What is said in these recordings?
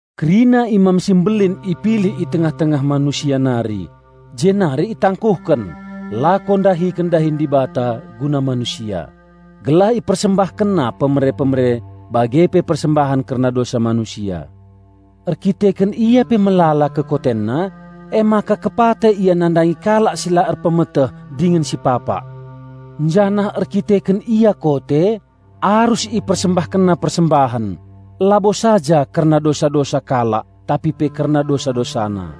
Kerina Imam si Mbelin ipilih i tengah-tengah manusia nari, jenari itangkuhken lako ndahiken dahin Dibata guna manusia, gelah ipersembahkenna pemere-pemere bage pe persembahen kerna dosa manusia. Erdandanken ia pe melala kekotenna, emaka kepate ia nandangi kalak si la erpemeteh dingen si papak. Janah erdandanken ia kote, arus ipersembahkenna persembahen, labo saja kerna dosa-dosa kalak tapi pe kerna dosa-dosana.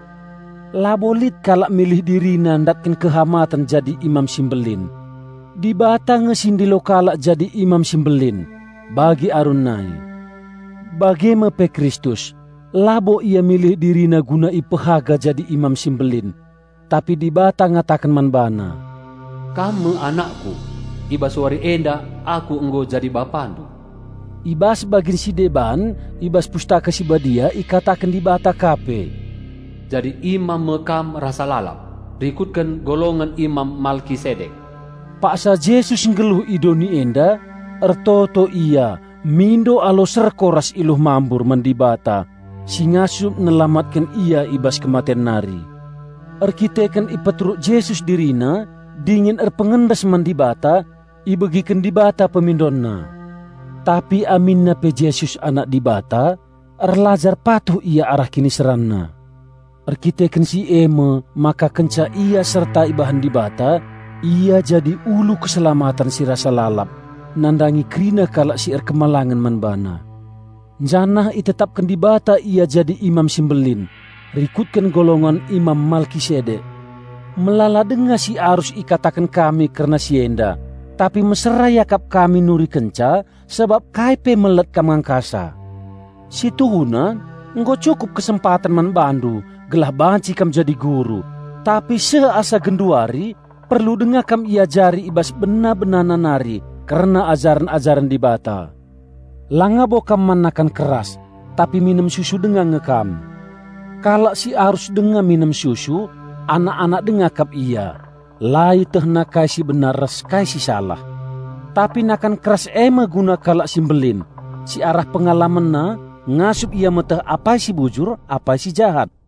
Labo lit kalak milih dirina ndatken kehamaten jadi Imam si Mbelin. Dibata nge si ndilo kalak jadi Imam si Mbelin, bagi Arun nai. Bage me pe Kristus, labo Ia milih DiriNa guna ipehaga jadi Imam si Mbelin. Tapi Dibata ngataken man BaNa, "Kam me AnakKu; i bas wari enda Aku nggo jadi BapaNdu." I bas bagin si deban i bas Pustaka Si Badia ikataken Dibata ka pe, "Jadi Imam me Kam rasa lalap, rikutken golongen Imam Malkisedek." Paksa Jesus nggeluh i doni enda, ertoto Ia mindo alu serko ras iluh mambur man Dibata si ngasup nelamatken Ia i bas kematen nari. Erdandanken ipeteruk Jesus DiriNa dingen erpengendes man Dibata, ibegiken Dibata PemindonNa. Tapi aminna pe Jesus Anak Dibata, erlajar patuh Ia arah KiniseranNa. Erdandanken si e me maka kenca Ia serta ibahan Dibata, Ia jadi ulu keselamaten si rasa lalap, nandangi kerina kalak si patuh man BaNa. Janah itetapken Dibata Ia jadi Imam si Mbelin "rikutken golongen Imam Malkisedek." Melala denga si arus ikataken kami kerna si enda, tapi mesera iakap kami nurikenca sabap kai pe melet kam ngangkasa. Si tuhuna nggo cukup kesempaten man bandu gelah banci kam jadi guru, tapi seh asa genduari perlu denga kam iajari i bas bena-benana nari kerna ajaren-ajaren Dibata. Langa bo kam man nakan keras, tapi minem susu denga nge kam. Kalak si arus denga minem susu, anak-anak denga kap ia, la ietehna kai si benar ras kai si salah. Tapi nakan keras e me guna kalak si mbelin, si arah pengalamenna ngasup perukurenna meteh apai si bujur apai si jahat.